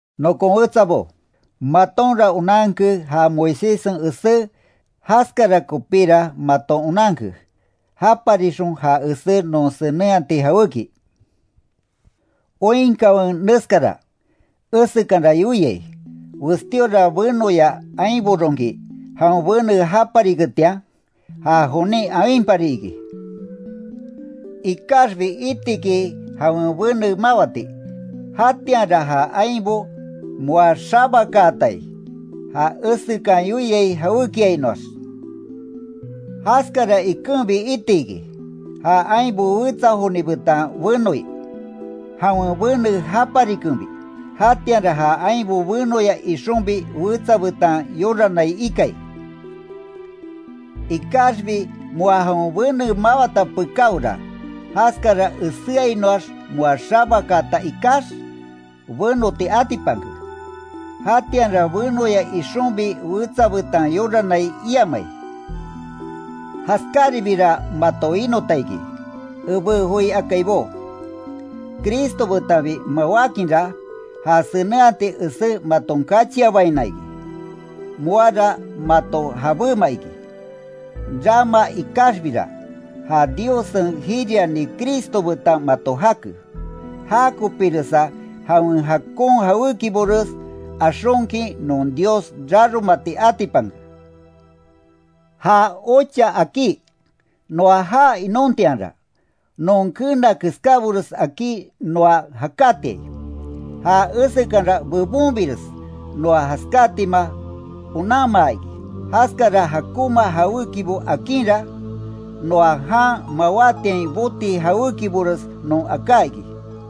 Nokon wetsabo, matonra onanke ja Moiséssen esé, jaskara kopíra maton onanke, japarixon ja esé non senenhati jawéki. Oinkanwe neskara, esekanra yoiai, westíora benoya ainboronki, jawen bene japariketian, ja jonin awinpari iki. Ikaxbi itiki jawen bene mawati, jatianra ja ainbo moa xabakaatai, ja esekan yoiai jawékiainoax. Jaskara ikenbi iti iki, ja ainbo wetsa joni betan benoi, jawen bene japarikenbi, jatianra ja ainbo benoya ixonbi wetsa betan yoranai ikai. Ikaxbi moa jawen bene mawata pekáora, jaskara eséainoax moa xabakaata ikax, benoti atipanke. Jatianra benoya ixonbi wetsa betan yoranai iamai. Jaskáribira mato winota iki, ebé joi akaibó. Cristo betanbi mawákinra, ja senenhati esé maton kachianbaina iki. Moara mato jabéma iki, rama ikaxbira, ja Diossen jiriani Cristo betan mato jake. Jakopiresa jawen jakon jawékibores axonkin non Dios raromati atipanke. Ja ocha akí, noa jaa inontianra, non keena keskábores akí noa jakátiai, ja esekanra bebonbires noa jaskátima onanmaa iki, jaskara jakonma jawékibo akinra, noa jan mawátiain boti jawékibores non aká iki.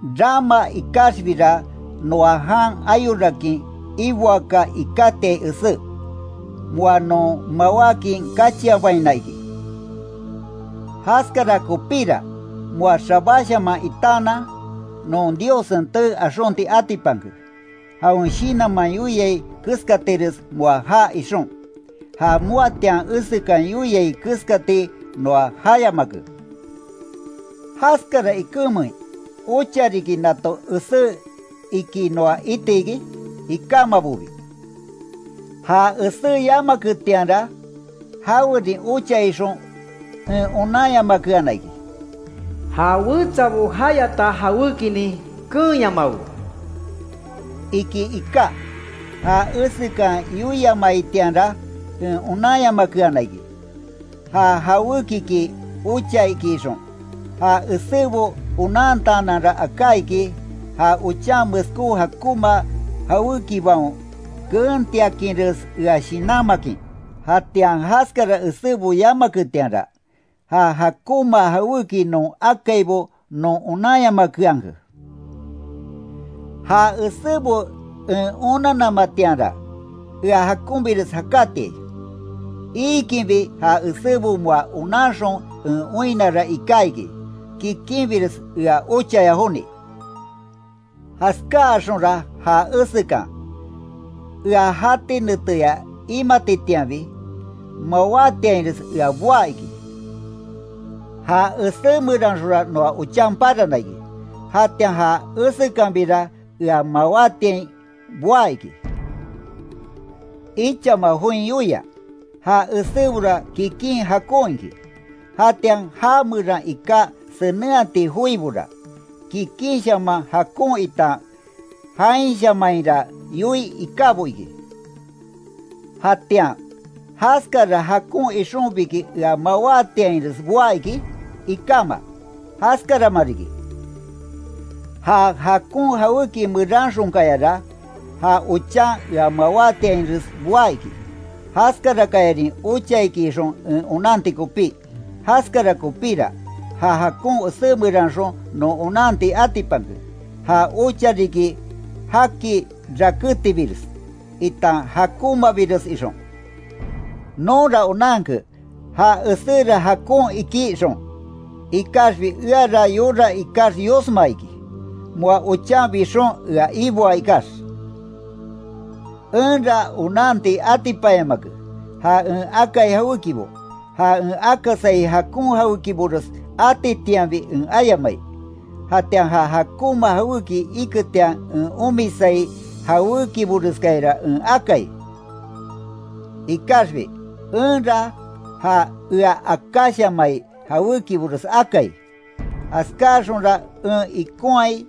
Rama ikaxbira, noa jan ayorakin iboaka ikátiai esé, moa non mawákin kachianbaina iki. Jaskara kopíra moa xabáshaman itaanan, non Diossen tee axonti atipanke, jawen Shinanman yoiai keskatires moa jaa ixon, ja moatian esekan yoiai keskati noa jayamake. ¿Jaskara ikenmein ocha riki nato esé iki noa iti iki? Ikámabobi. Ja esé yamaketianra, jawerin ocha ixon en onanyamakeana iki: “Ja wetsabo jayata jawékinin keenyamawe”, iki iká, ja esekan yoiamaitianra en onanyamakeana iki, ja jawékiki ocha iki ixon. Ja esébo onantaananra aka iki, ja ochan meskó jakonma jawékibaon keentiakinres ea shinanmakin. Jatian jaskara esébo yamaketianra, ja jakonma jawéki non akaibo non onanyamakeanke. Ja esébo en onannamatianra, ea jakonbires jakátiai. Iikinbi ja esébo moa onanxon en oinnara iká iki, kikinbires ea ochaya joni. Jaskáaxonra ja esekan, ea jati neteya imatitianbi, mawátiainres ea boá iki. Ja esé meranxonra noa ochan parana iki. Jatian ja esekanbira ea mawátiain boá iki. Ichama join yoia, Ja esébora kikin jakon iki, jatian ja meran iká senenhati joibora, kikinshaman jakon itan jainshamanhira yoii ikábo iki. Jatian ¿Jaskara jakon ixonbiki ea mawátiainres boá iki? Ikáma, jaskarama riki. Ja jakon jawéki meranxonkayara, ja ochan ea mawátiainres boá iki, jaskarakayarin ocha iki ixon en onanti kopí. Jaskara kopíra, ja jakon esé meranxon non onanti atipanke, ja ocha riki jaki rakétibires, itan jakonmabires ixon. Nonra onanke, ja eséra jakon iki ixon, ikaxbi eara yora ikax yosma iki, moa ochan bixon ea iboa ikax. Enra onanti atipanyamake, ja en akai jawékibo, ja en akasai jakon jawékibores atitianbi en ayamai, jatian ja jakonma jawéki iketian en omisai jawékiboreskayara en akai. Ikaxbi, enra ja ea akáshamai jawékibores akai, jaskáaxonra en ikonhai,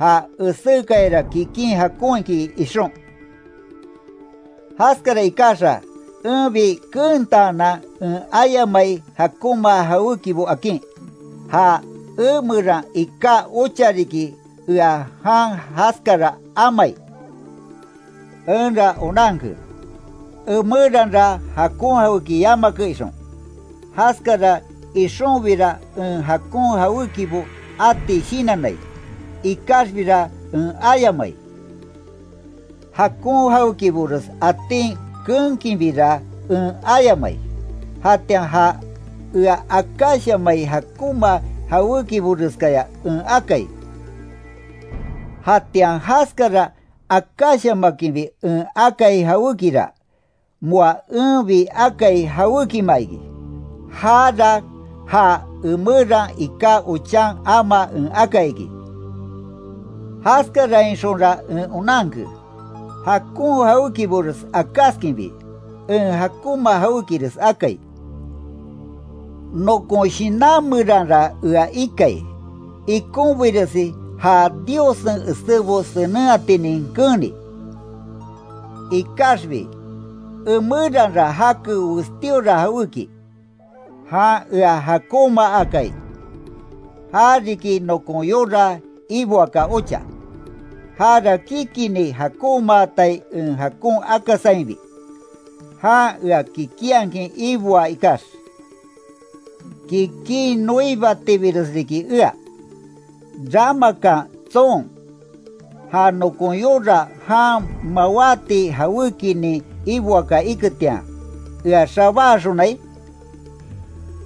ja esékayara kikin jakon iki ixon. Jaskara ikaxa, enbi keentaanan en ayamai jakonma jawékibo akin, ja emeran iká ocha riki ea jan jaskara amai. Enra onanke, emeranra jakon jawéki yamake ixon. Jaskara ixonbira en jakon jawékibo ati shinannai, ikaxbira en ayamai. Jakon jawékibores atin keenkinbira en ayamai, jatian ja ea akáshamai jakonma jawékiboreskaya en akai. Jatian jaskara akáshamakinbi en akai jawékira, moa enbi akai jawékima iki. Jara ja emeran iká ochan amaa en akai iki. Jaskarainxonra en onanke, jakon jawékibores akáskinbi, en jakonma jawékires akai. Nokon shinan meranra ea ikai, ikonbiresi ja Diossen esébo senenhatinin keeni, Ikaxbi emeranra jake westíora jawéki, jan ea jakonmaakai, jariki nokon yora iboaka ocha, jara kikinni jakonmatai en jakon akasainbi, jan ea kikinhakin iboaa ikax. ¡Kikin noibatibires riki ea! ¿Ramakan tson, ja nokon yora jan mawáti jawékinin iboaka iketian, ea xabáaxonai?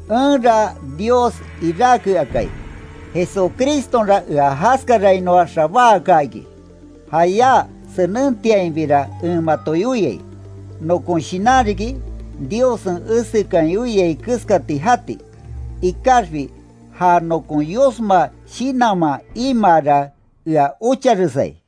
Enra Dios iráke akai, Jesucristonra ea jaskarainoa xabáaka iki. Jayá senentiainbira en mato yoiai, nokon shinan riki, Diossen esekan yoiai keskati jati, ikaxbi ja nokon yosma shinanman imaara ea ocharesai.